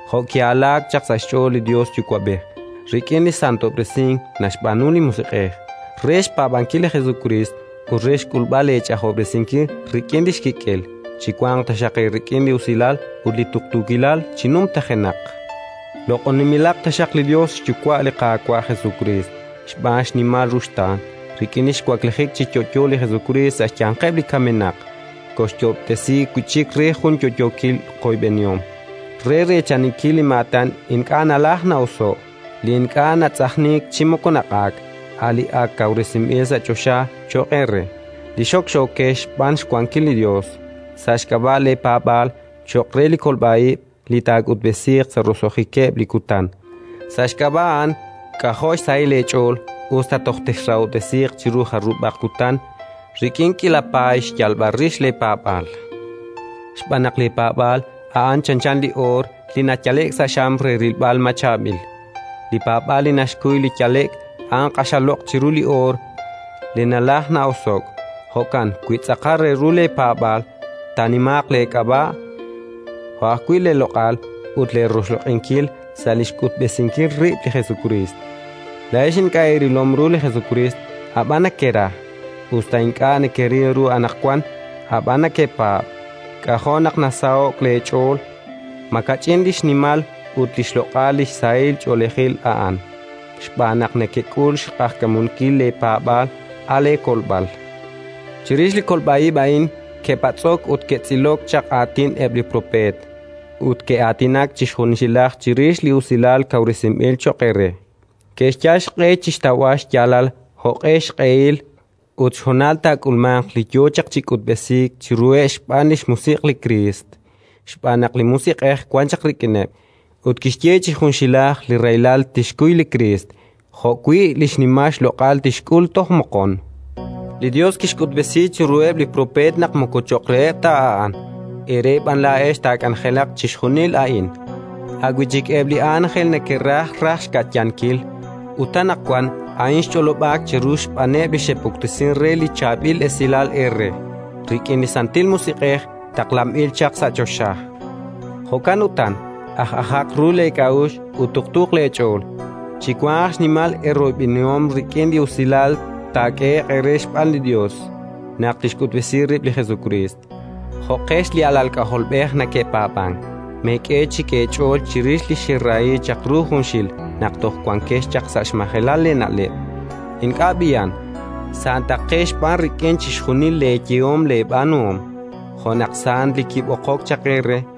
jo' ki'alaak chaq sa' xch'ool li Yos Yuwa'b'ej, rik'in li santob'resink naxb'aanu li Musiq'ej, re xpaab'ankil li Jesukriist ut re xk'ulb'al leech'ajob'resinkil rik'in li xkik'el. Chiwanq taxaq eerik'in li usilal ut li tuqtuukilal chi numtajenaq. Loq'oninb'ilaq taxaq li Yos xYuwa' li Qaawa' Jesukriist! Xb'aan xnimal ruxtaan, rik'in li xwaklijik chi yo'yo li Jesukriist sa' xyanqeb' li kamenaq, kooxyoob'tesi wi' chik re jun yo'yookil qoyb'enihom, re reechaninkil li maatan ink'a' nalajk na'oso'k, li ink'a' natz'ajniik chi moko naq'aak, a' li ak kawresinb'il sa' choxa cho'q eere li xokxookex xb'aan xwankil li Yos, sa' xk'ab'a' leepaab'aal, cho'q re li kolb'a ib' li taak'utb'esiiq sa' roso'jikeb' li kutan. Sa' xk'ab'a' a'an k'ajo' xsahil eech'ool, us ta toj texrahob'tesiiq chiru jarub'aq kutan rik'in k'iila paay xyalb'al rix leepaab'aal. Xb'aan naq leepaab'aal, a'an chanchan li oor li nayale'k sa' xam re rilb'al ma chaab'il. Li paab'aal li naxkuy li yale'k, a'an q'axal loq' chiru li oor li nalajk na'oso'k. Jo'kan wi tz'aqal re ru leepaab'aal, taanimaaq leek'ab'a', jo' ajwi' leeloq'al ut leeroxloq'inkil sa' li xk'utb'esinkil rib' li Jesukriist. Laa'ex ink'a' eerilom ru li Jesukriist, ab'an nekera. Us ta ink'a' nekeril ru anaqwan, ab'an nekepaab', k'ajo' naq nasaho'k leech'ool: makach'in li xnimal ut li xloq'al li sahil ch'oolejil a'an! Xb'aan naq nekek'ul xq'ajkamunkil leepaab'aal, a' leekolb'al. Chirix li kolb'a ib' a'in ke'patz'ok ut ke'tz'ilok chaq aatin eb' li propeet, ut ke'aatinak chi junxilaj chirix li usilal kawresinb'il cho'q eere. Ke'xyal xq'e chi xtawb'al xyaalal jo'q'e xq'ehil ut xhonal taak'ulmanq li yo chaq chi k'utb'esiik chiruheb' xb'aan li xMusiq' li Kriist: xb'aan naq li Musiq'ej wan chaq rik'ineb', ut kixye chi junxilaj li rahilal tixkuy li Kriist jo'wi' li xnimal xloq'al tixk'ul toj moqon. Li Yos kixk'utb'esi chiruheb' li propeet naq moko cho'q reheb' ta a'an, eere b'an laa'ex taak'anjelaq chixjunil a'in, a' wi' chikeb' li ánjel neke'raj raj xka'yankil. Ut anaqwan a'in xch'olob'aak cheru xb'aaneb' li xe'puktesink re li Chaab'il Esilal eere, rik'in li Santil Musiq'ej taqlanb'il chaq sa' choxa. Jo'kan utan, aj'ajaq ru leek'a'uxl ut tuqtuuq leech'ool. Chiwanq xnimal eeroyb'enihom rik'in li usilal taak'ehe'q eere xb'aan li Yos, naq tixk'utb'esi rib' li Jesukriist. Jo'qex li alal k'ajolb'ej neke'paab'ank, meek'e chik eech'ool chirix li xerahi chaq ru junxil naq toj wankex chaq sa' xmajelal leena'leb'. Ink'a' b'i'an. Santaqex b'an rik'in chixjunil leeyehom leeb'aanuhom, jo' naq sant Li kib'oqok chaq eere;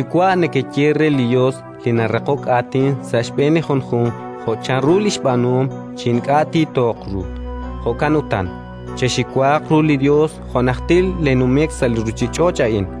“QaYuwa'” nekeye re li Yos li naraqok aatin sa' xb'een li junjunq jo' chanru li xb'aanuhom chi ink'a' tiitooq ru. Jo'kan utan, chexiwaaq ru li Yos jo' najtil leenumik sa' li ruuchich'och' a'in.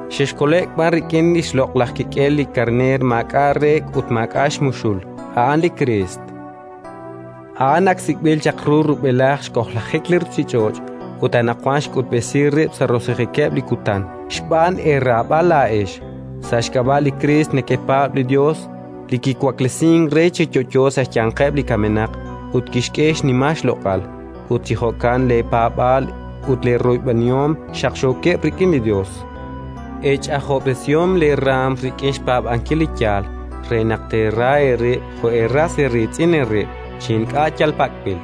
xexkole'k b'an rik'in li xloq'laj kik'el li karneer maak'a' reek' ut maak'a' xmuxul, a'an li Kriist. A'an ak sik'b'il chaq ru rub'elaj xk'ojlajik li ruuchich'och', ut anaqwan xk'utb'esi rib' sa' roso'jikeb' li kutan xb'aan eeraab'al laa'ex. Sa' xk'ab'a' li Kriist nekepaab' li Yos, li kiwaklesink re chi yo'yo sa' xyanqeb' li kamenaq ut kixk'e xnimal xloq'al: ut chi jo'kan leepaab'aal ut leeroyb'enihom xaqxookeb' rik'in li Yos. Eech'ajob'resihom leeraanm rik'in xpaab'ankil li yaal, re naq teera eerib' jo' eeras eeriitz'in eerib', chi ink'a' yal pak'b'il.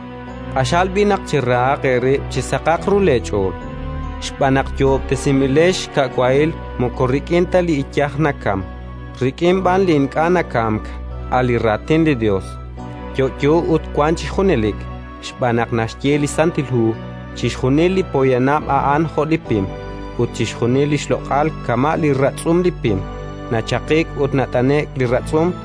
Q'axal b'i' naq cherahaq eerib' chi saqaq ru leech'ool, xb'aan naq yoob'tesinb'ilex xka' wahil moko rik'in ta li iyaj nakamk, rik'in b'an li ink'a' nakamk, a' li Raatin li Yos, yo'yo ut wank chi junelik. Xb'aan naq naxye li Santil Hu: “Chixjunil li poyanam a'an jo' li pim, ut chixjunil li xloq'al kama' li ratz'um li pim: nachaqik ut nat'ane'k li ratz'um.